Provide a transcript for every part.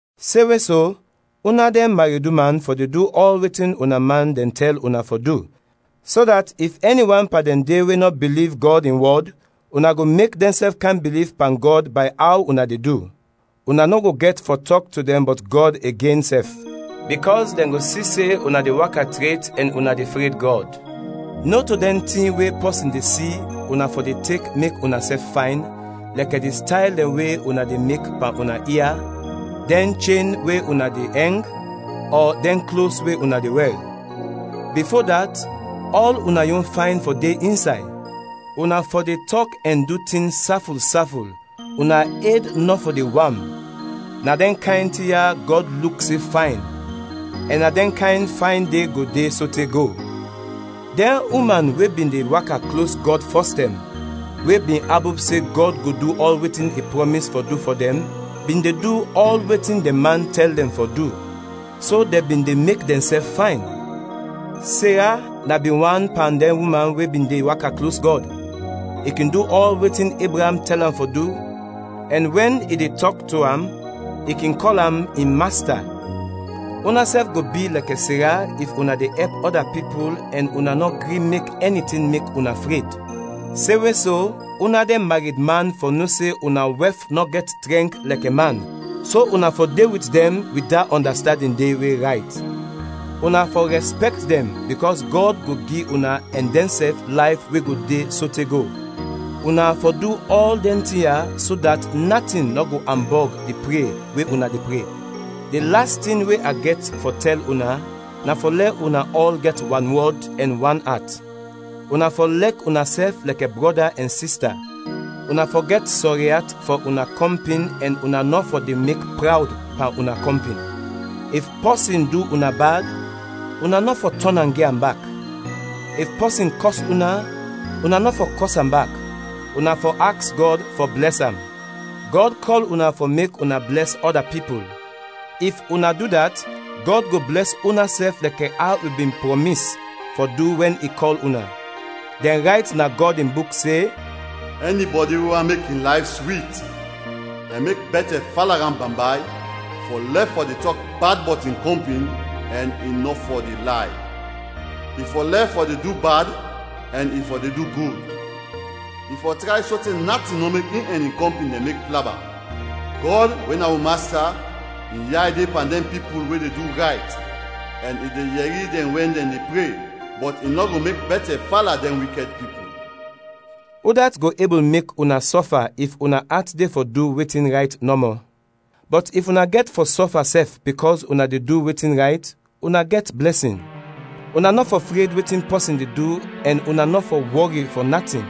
Semwe so, una dɛn mareduman fɔ de du ɔl wetin una man dɛn tɛl una fɔ du, so dat if ɛni wan pan dɛn de we nɔ biliv Gɔd in wɔd, una go mek dɛnsɛf kam biliv pan Gɔd bay aw una de du. Una nɔ go gɛt fɔ tɔk to dɛn bɔt Gɔd igen sɛf, bikɔs dɛn go si se una de waka tret ɛn una de fred Gɔd. Nɔto dɛn tin we pɔsin de si una fɔ de tek mek unasɛf fayn, lɛkɛ di stayl dɛn we una de mek pan una ia, dɛn chen we una de ɛng, ɔ dɛn klos we una de wɛr. Bifo dat, ɔl una yon fayn fɔ de insay; una fɔ de tɔk ɛn du tin saful saful, una ed nɔ fɔ de wam, na dɛn kayn tin ya Gɔd luk se fayn, ɛn na dɛn kayn fayn de go de sote go. Dɛn uman we bin de waka klos Gɔd fɔstɛm, we bin abop se Gɔd go du ɔl wetin i prɔmis fɔ du fɔ dɛn, bin de du ɔl wetin dɛn man tɛl dɛn fɔ du; so dɛn bin de mek dɛnsɛf fayn. Sera na bin wan pan dɛn uman we bin de waka klos Gɔd; i kin du ɔl wetin Ebraam tɛl am fɔ du ɛn wɛn i de tɔk to am, i kin kɔl am in masta. Unasɛf go bi lɛkɛ Sera if una de ɛp ɔda pipul ɛn una nɔ gri mek ɛni tin mek una fred. Semwe so, una dɛn maredman fɔ no se una wɛf nɔ gɛt trɛnk lɛkɛ man, so una fɔ de wit dɛn wit da ɔndastandin de, we rayt. Una fɔ rɛspɛkt dɛn bikɔs Gɔd go gi una ɛn dɛnsɛf layf we go de sote go. Una fɔ du ɔl dɛn tin ya, so dat natin nɔ go ambɔg di pre we una de pre. Di las tin we a gɛt fɔ tɛl una, na fɔ lɛ una ɔl gɛt wanwɔd, ɛn wan at; una fɔ lɛk unasɛf lɛkɛ brɔda ɛn sista, una fɔ gɛt sɔri at fɔ una kɔmpin ɛn una nɔ fɔ de mek prawd pan una kɔmpin. If pɔsin du una bad, una nɔ fɔ tɔn am gi am bak; if pɔsin kɔs una, una nɔ fɔ kɔs am bak, una fɔ aks Gɔd fɔ blɛs am. Gɔd kɔl una fɔ mek una blɛs ɔda pipul; if una du dat, Gɔd go blɛs unasɛf lɛkɛ aw i bin prɔmis fɔ du wɛn i kɔl una. Dɛn rayt na Gɔd in Buk se, “Ɛnibɔdi we want mek in layf swit ɛn mek bɛtɛ fala am bambay fɔ lɛf fɔ de tɔk bad bɔt in kɔmpin ɛn i nɔ fɔ de lay. I fɔ lɛf fɔ de du bad ɛn i fɔ de du gud; i fɔ tray sote natin nɔ mek in ɛn in kɔmpin dɛn mek plaba. Gɔd, we na wi Masta, in yay de pan dɛn pipul we de du rayt ɛn i de yɛri dɛn wɛn dɛn de pre; bɔt i nɔ go mek bɛtɛ fala dɛn wikɛd pipul.” Udat go ebul mek una sɔfa if una at de fɔ du wetin rayt nɔmɔ? Bɔt if una gɛt fɔ sɔfa sɛf bikɔs una de du wetin rayt, una gɛt blɛsin! Una nɔ fɔ fred wetin pɔsin de du ɛn una nɔ fɔ wɔri fɔ natin.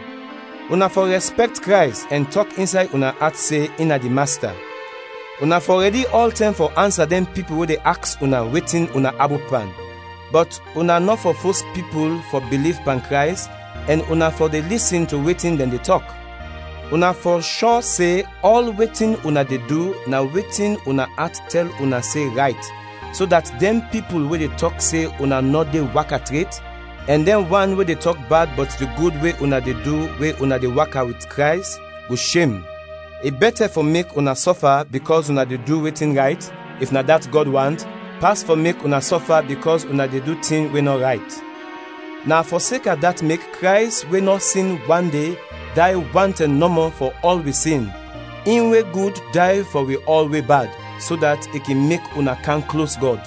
Una fɔ rɛspɛkt Krays ɛn tɔk insay una at se in na di Masta. Una fɔ rɛdi ɔltɛm fɔ ansa dɛn pipul we de aks una wetin una abop pan, bɔt una nɔ fɔ fos pipul fɔ biliv pan Krays ɛn una fɔ de lisin to wetin dɛn de tɔk. Una fɔ shɔ se ɔl wetin una de du na wetin una at tɛl una se rayt, so dat dɛn pipul we de tɔk se una nɔ de waka tret, ɛn dɛn wan we de tɔk bad bɔt di gud we una de du we una de waka wit Krays, go shem. I bɛtɛ fɔ mek una sɔfa bikɔs una de du wetin rayt, if na dat Gɔd want, pas fɔ mek una sɔfa bikɔs una de du tin we nɔ rayt. Na fɔseka dat mek Krays we nɔ sin wande, day wan tɛm nɔmɔ fɔ ɔl wi sin, in we gud day fɔ wi ɔl we bad, so dat i kin mek una kam klos Gɔd.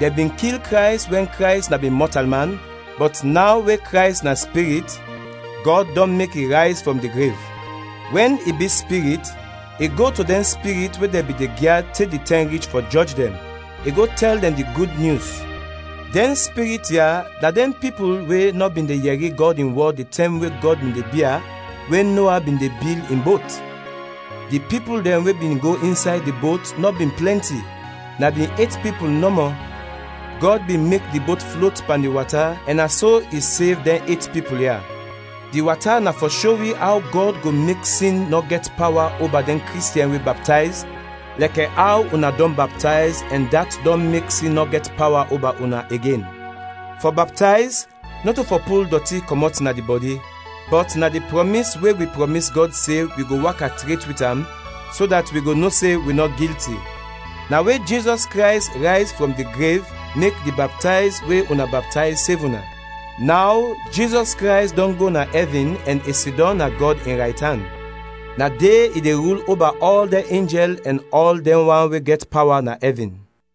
Dɛn bin kil Krays wɛn Krays na bin mɔtalman, bɔt naw we Krays na Spirit, Gɔd dɔn mek i rayz frɔm di grev. Wɛn i bi Spirit, i go to dɛn spirit we dɛn bin de gyad te di tɛm rich fɔ jɔj dɛn, i go tɛl dɛn di Gud Nyus. Dɛn spirit ya na dɛn pipul we nɔ bin de yɛri Gɔd in wɔd di tɛm we Gɔd bin de bia, we Noa bin de bil in bot. Di pipul dɛn we bin go insay di bot nɔ bin plɛnti; na bin et pipul nɔmɔ. Gɔd bin mek di bot flot pan di wata ɛn na so i sev dɛn et pipul ya. Di wata na fɔ sho wi aw Gɔd go mek sin nɔ gɛt pawa oba dɛn Kristiɛn we baptayz, lɛkɛ aw una dɔn baptayz ɛn dat dɔn mek sin nɔ gɛt pawa oba una igen. Fɔ baptayz, nɔto fɔ pul dɔti kɔmɔt na di bɔdi, bɔt na di prɔmis we wi prɔmis Gɔd se wi go waka tret wit am so dat wi go no se wi nɔ gilti. Na we Jizɔs Krays rayz frɔm di grev mek di baptayz we una baptayz sev una. Naw Jizɔs Krays dɔn go na ɛvin ɛn i sidɔm na Gɔd in raytan; na de i de rul oba ɔl dɛn enjɛl ɛn ɔl dɛn wan we gɛt pawa na ɛvin.